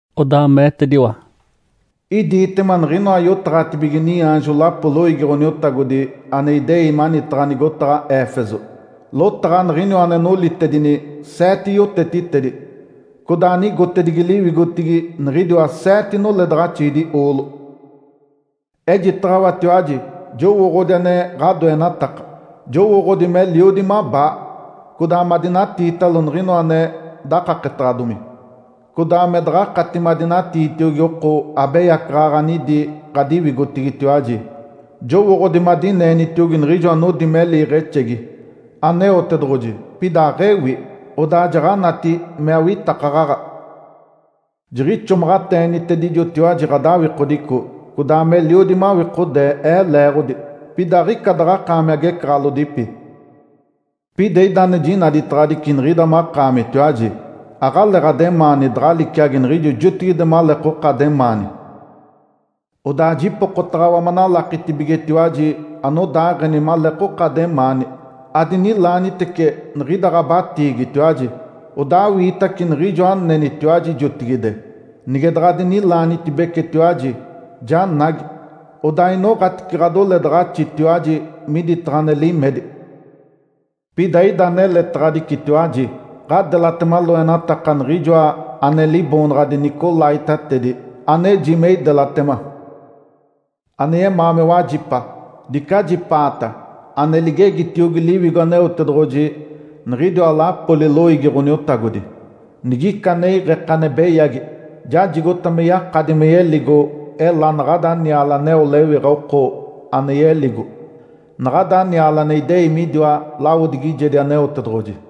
Odaa meetediwa, “Idiitema niɡ̶inoa yotaɡ̶atibige niaanjo lapo loiigi Ǥoniotagodi ane idei manitaɡ̶a nigotaɡ̶a Éfeso, lotaɡ̶a Niɡ̶iniwa ane nolitedini seete yotetitedi codaa anigotedigi liwigotigi niɡ̶idiwa seete noledaɡ̶axiidi oolo. Ejitaɡ̶awatiwaji jowooɡ̶odi ane ɡ̶adoenataka. Jowooɡ̶odi meliodi mabaa, codaa madinatiitalo niɡ̶inoa ane dakaketaɡ̶adomi, codaa me daɡ̶akati madinatiitiogi oko abeyacaɡ̶aɡ̶a anidi ɡ̶adiwigotigitiwaji. Jowooɡ̶odi madineenitiogi niɡ̶ijo anodi me liiɡ̶exegi Aneotedoɡ̶oji pida aɡ̶ewi, odaa jaɡ̶anati me awitakaɡ̶aɡ̶a. Jiɡ̶ixomaɡ̶ateenitedijotiwaji ɡ̶adawikodico, codaa meliodi mawikodee Ee leeɡ̶odi, pida aɡ̶ica daɡ̶akaami agecaɡ̶alodipi. Pida ida ane jinaditaɡ̶adici niɡ̶ida makaamitiwaji, aɡ̶aleeɡ̶ademaani daɡ̶a liciagi niɡ̶ijo jotigide maleekoka ademaani. Odaa jipokotaɡ̶awa manalakitibigetiwaji anodaaɡ̶eni maleekoka ademaani, adinilaanitece niɡ̶ida ɡ̶abatiigitiwaji, odaa awiitace niɡ̶ijo anenitiwaji jotigide. Nige daɡ̶a adinilaanitibecetiwaji, janagi, odaa inoɡ̶atice ɡ̶adoledaɡ̶axitiwaji miditaɡ̶a ane limedi. Pida ida aneletaɡ̶adicitiwaji. Ǥadelatema loenataka niɡ̶ijoa ane liboonaɡ̶adi ‘nicolaítatedi’, aneji me idelatema. Ane yemaa me wajipa, dice ajipaata ane ligegitiogi Liwigo Aneotedoɡ̶oji niɡ̶idiwa lapoli loiigi Ǥoniotagodi! Nigica ane iɡ̶eke ane beyagi, jajigota me yakadi me yeligo ela naɡ̶ada niale aneo lewiɡ̶a oko ane yeligo, naɡ̶ada niale ane idei midiwa lawodigijedi Aneotedoɡ̶oji.”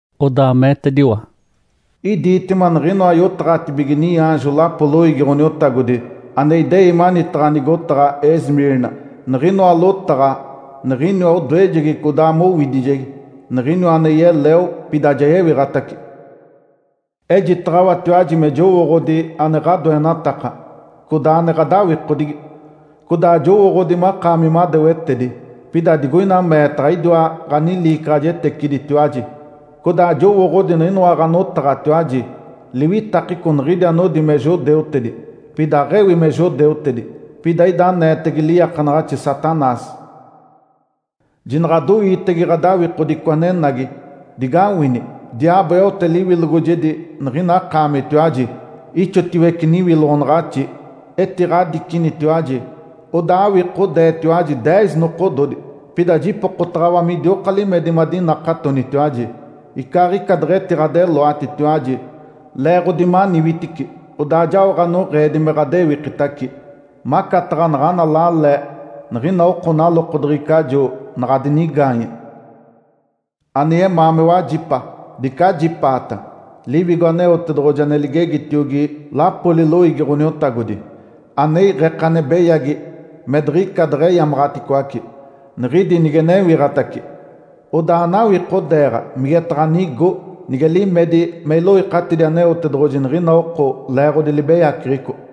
Odaa meetediwa, “Idiitema niɡ̶inoa yotaɡ̶atibige niaanjo lapo loiigi Ǥoniotagodi ane idei manitaɡ̶a nigotaɡ̶a Esmirna, niɡ̶inoa lotaɡ̶a Niɡ̶iniwa anodoejegi codaa mowidijegi, Niɡ̶iniwa ane yeleo, pida ja yewiɡ̶atace. Ejitaɡ̶awatiwaji me jowooɡ̶odi ane ɡ̶adoenataka, codaa ane ɡ̶adawikodigi, codaa jowooɡ̶odi makaami madewetedi. (Pida digoina meetaɡ̶a idiwa ɡ̶aniliicaɡ̶ajeteciditiwaji). Codaa jowooɡ̶odi niɡ̶inoa ɡ̶anotaɡ̶atiwaji liwitakeco niɡ̶idi anodi me judeutedi, pida aɡ̶ewi me judeutedi. Pida ida aneetege liiakanaɡ̶axi Satanás. Jinaɡ̶adoiitege ɡ̶adawikodico anenagi. Digawini! Diaabo eote liwilogojedi niɡ̶ina akaamitiwaji, ixotiwece niwiloɡ̶onaɡ̶axi, etiɡ̶adicinitiwaji. Odaa awikodeetiwaji deez nokododi. Pida jipokotaɡ̶awa midioka limedi madinakatonitiwaji, icaaɡ̶ica deɡ̶etiɡ̶adeloatitiwaji (leeɡ̶odi maniwitici), odaa jao ɡ̶anoɡ̶eedi me ɡ̶adewikitace, macataɡ̶a naɡ̶ana lale niɡ̶ina oko nalokodeɡ̶ecajo, naɡ̶a dinigaanye. Ane yemaa me wajipa, dice ajipaata Liwigo Aneotedoɡ̶oji ane ligegitiogi lapoli loiigi Ǥoniotagodi. Ane iɡ̶eke ane beyagi me diɡ̶ica deɡ̶eyamaɡ̶aticoace, niɡ̶idi nige newiɡ̶atace, odaa anawikodeeɡ̶a migetaɡ̶a nigo (nige limedi me iloikatidi Aneotedoɡ̶oji niɡ̶ina oko leeɡ̶odi libeyaceɡ̶eco).”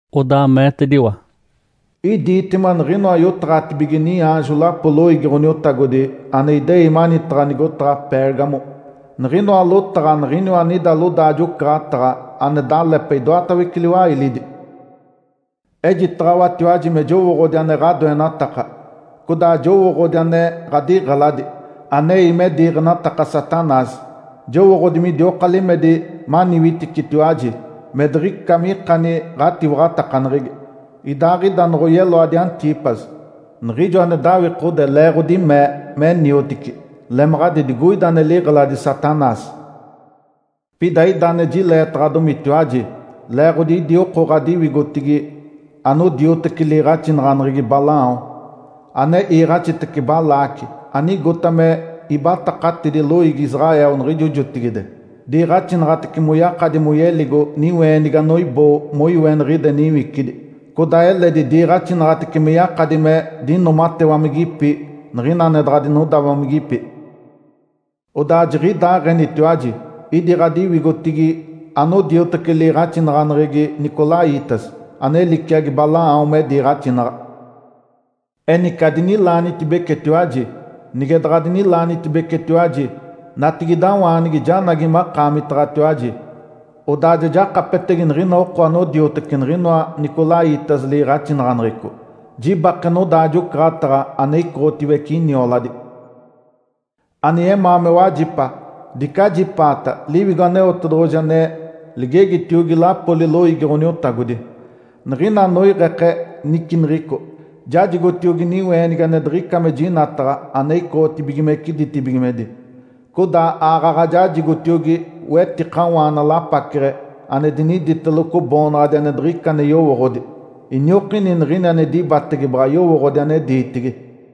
Odaa meetediwa, “Idiitema niɡ̶inoa yotaɡ̶atibige niaanjo lapo loiigi Ǥoniotagodi ane idei manitaɡ̶a nigotaɡ̶a Pérgamo, niɡ̶inoa lotaɡ̶a niɡ̶iniwa anida lodaajo-ocaɡ̶ataɡ̶a ane dalepe idoatawece liwailidi. Ejitaɡ̶awatiwaji me jowooɡ̶odi ane ɡ̶adoenataka, codaa jowooɡ̶odi ane ɡ̶adiɡ̶eladi, anei me diiɡ̶enataka Satanás. Jowooɡ̶odi midioka limedi maniwiticitiwaji me diɡ̶ica mikani ɡ̶atiwaɡ̶atakaneɡ̶egi, idaaɡ̶ida noɡ̶oyeloadi Antipas, niɡ̶ijo ane dawikode leeɡ̶odi mee me niotici. Lemaɡ̶adi digoida ane liɡ̶eladi Satanás. Pida ida ane jileetaɡ̶adomitiwaji, leeɡ̶odi idi oko ɡ̶adiwigotigi anodioteci liiɡ̶axinaɡ̶aneɡ̶egi Balaão, ane iiɡ̶axitece Balaque anigota me ibatakatidi loiigi Israel niɡ̶ijo jotigide. Diiɡ̶axinaɡ̶atece moyakadi moyeligo niweenigi anoiboo moiweniɡ̶ide niwicidi, codaa eledi diiɡ̶axinaɡ̶atece me yakadi me dinoomatewamigipi niɡ̶ina ane daɡ̶a dinodawamigipi. Odaa jiɡ̶idaaɡ̶enitiwaji idi ɡ̶adiwigotigi anodioteci liiɡ̶axinaɡ̶aneɡ̶egi ‘nicolaítas’ (ane liciagi Balaão me diiɡ̶axinaɡ̶a). Enice adinilaanitibecetiwaji! Nige daɡ̶adinilaanitibecetiwaji, natigidawaanigi janagi makaamitaɡ̶atiwaji, odaa ja jakapetege niɡ̶ina oko anodioteci niɡ̶ijoa nicolaítas liiɡ̶axinaɡ̶aneɡ̶eco, jibake nodaajo-ocaɡ̶ataɡ̶a ane icoɡ̶otiwece inioladi. Ane yemaa me wajipa, dice ajipaata Liwigo Aneotedoɡ̶oji ane ligegitiogi lapoli loiigi Ǥoniotagodi! Niɡ̶ina anoiɡ̶eke niciniɡ̶ico, jajigotiogi niweenigi ane diɡ̶ica me jinataɡ̶a ane icoɡ̶otibigimece ditibigimedi. Codaa aaɡ̶aɡ̶a jajigotiogi wetikawaana lapaceɡ̶e ane diniditeloco boonaɡ̶adi ane diɡ̶ica ane yowooɡ̶odi, iniokini niɡ̶ini ane dibatege baɡ̶a yowooɡ̶odi ane diitigi.”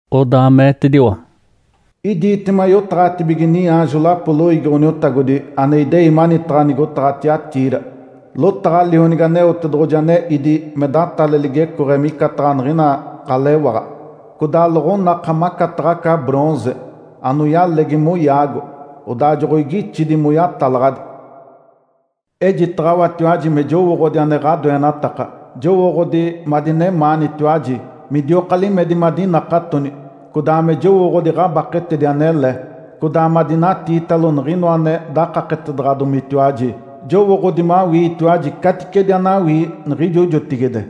Odaa meetediwa, “Idiitema yotaɡ̶atibige niaanjo lapo loiigi Ǥoniotagodi ane idei manitaɡ̶a nigotaɡ̶a Tiatira, lotaɡ̶a Lionigi Aneotedoɡ̶oji ane ídi me datale ligecooɡ̶e micataɡ̶a niɡ̶ina ɡ̶alewaɡ̶a, codaa loɡ̶onaka macataɡ̶a aca ‘bronze’ anoyalegi moyaago, odaa joɡ̶oigixidi moyatalaɡ̶adi. Ejitaɡ̶awatiwaji me jowooɡ̶odi ane ɡ̶adoenataka. Jowooɡ̶odi madinemaanitiwaji, midioka limedi madinakatoni, codaa me jowooɡ̶odi ɡ̶abaketedi anele, codaa madinatiitalo niɡ̶inoa ane dakaketedaɡ̶adomitiwaji. Jowooɡ̶odi mawiitiwaji caticedi anawii niɡ̶ijo jotigide.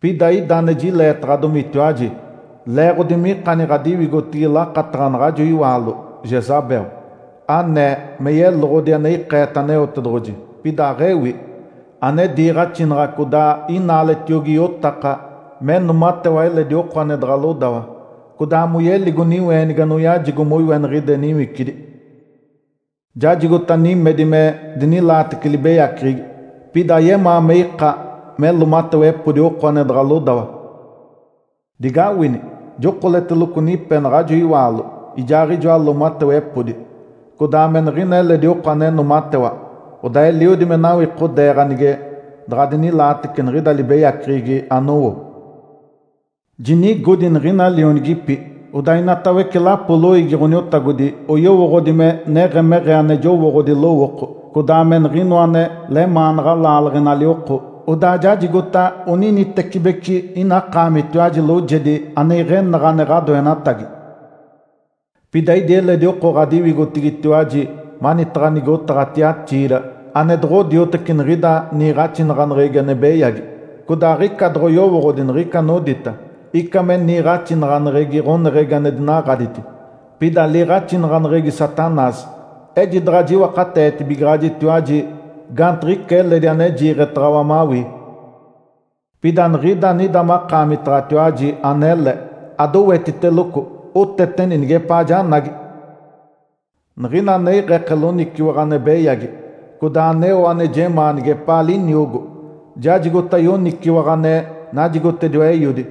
Pida ida ane jileetaɡ̶adomitiwaji, leeɡ̶odi mikani ɡ̶adiwigotigi lakataɡ̶a naɡ̶ajo iwaalo Jezabel, anee me yeloɡ̶odi ane ikeete Aneotedoɡ̶oji, pida aɡ̶ewi. Ane diiɡ̶axinaɡ̶a codaa inaaletiogi iotaka me noomatewa eledi oko ane daɡ̶a lodawa, codaa moyeligo niweenigi anoyajigo moiweniɡ̶ide niwicidi. Jajigota nimedi me dinilaatece libeyaceɡ̶egi, pida ayemaa me ika me loomatewepodi oko ane daɡ̶a lodawa. Digawini! Jokoleteloco nipe naɡ̶ajo iwaalo ijaaɡ̶ijoa loomatewepodi codaa me niɡ̶ina eledi oko ane noomatewa, odaa eliodi me nawikodeeɡ̶a nige daɡ̶a dinilaatece niɡ̶ida libeyaceɡ̶egi anowo. Jinigodi niɡ̶ina lionigipi, odaa inatawece lapo loiigi Ǥoniotagodi oyowooɡ̶odi me neɡ̶emeɡ̶ee ane jowooɡ̶odi lowooko, codaa me niɡ̶inoa ane lemaanaɡ̶a laaleɡ̶enali oko. Odaa jajigota oninitecibeci ina akaamitiwaji loojedi ane iɡ̶enaɡ̶a ane ɡ̶adoenatagi. Pida idi eledi oko ɡ̶adiwigotigitiwaji manitaɡ̶a nigotaɡ̶a Tiatira ane doɡ̶odioteci niɡ̶ida niiɡ̶axinaɡ̶aneɡ̶egi ane beyagi, codaa aɡ̶ica doɡ̶oyowooɡ̶odi niɡ̶ica anodita ‘Ica me niiɡ̶axinaɡ̶aneɡ̶egi ɡ̶oneɡ̶egi ane dinaɡ̶aditi, pida liiɡ̶axinaɡ̶aneɡ̶egi Satanás’. Ejidaɡ̶a jiwakateetibigaɡ̶ajitiwaji gaantiɡ̶ica eledi ane jiiɡ̶etaɡ̶awa mawii. Pida niɡ̶ida anida makaamitaɡ̶atiwaji anele, adowetiteloco, oteteni nigepaa janagi. Niɡ̶ina ane iɡ̶eke loniciwaɡ̶a ane beyagi, codaa aneo ane jemaa nigepaa liniogo, jajigota yoniciwaɡ̶a ane najigotediwa Eiodi.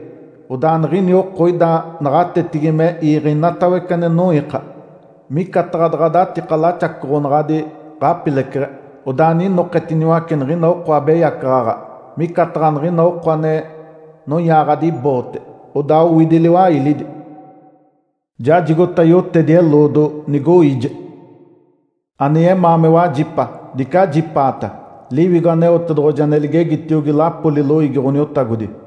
Odaa niɡ̶ini oko ida naɡ̶atetigi me iiɡ̶e inoatawece ane noiika. Micataɡ̶a daɡ̶a datika laxacoɡ̶onaɡ̶adi ɡ̶apileceɡ̶e, odaa ninoketiniwace niɡ̶ina oko abeyacaɡ̶aɡ̶a micataɡ̶a niɡ̶ina oko ane noyaaɡ̶adi boote, odaa owidi liwailidi. Jajigota yotedi-eloodo, nigoiije. Ane yemaa me wajipa, dice ajipaata Liwigo Aneotedoɡ̶oji ane ligegitiogi lapoli loiigi Ǥoniotagodi!”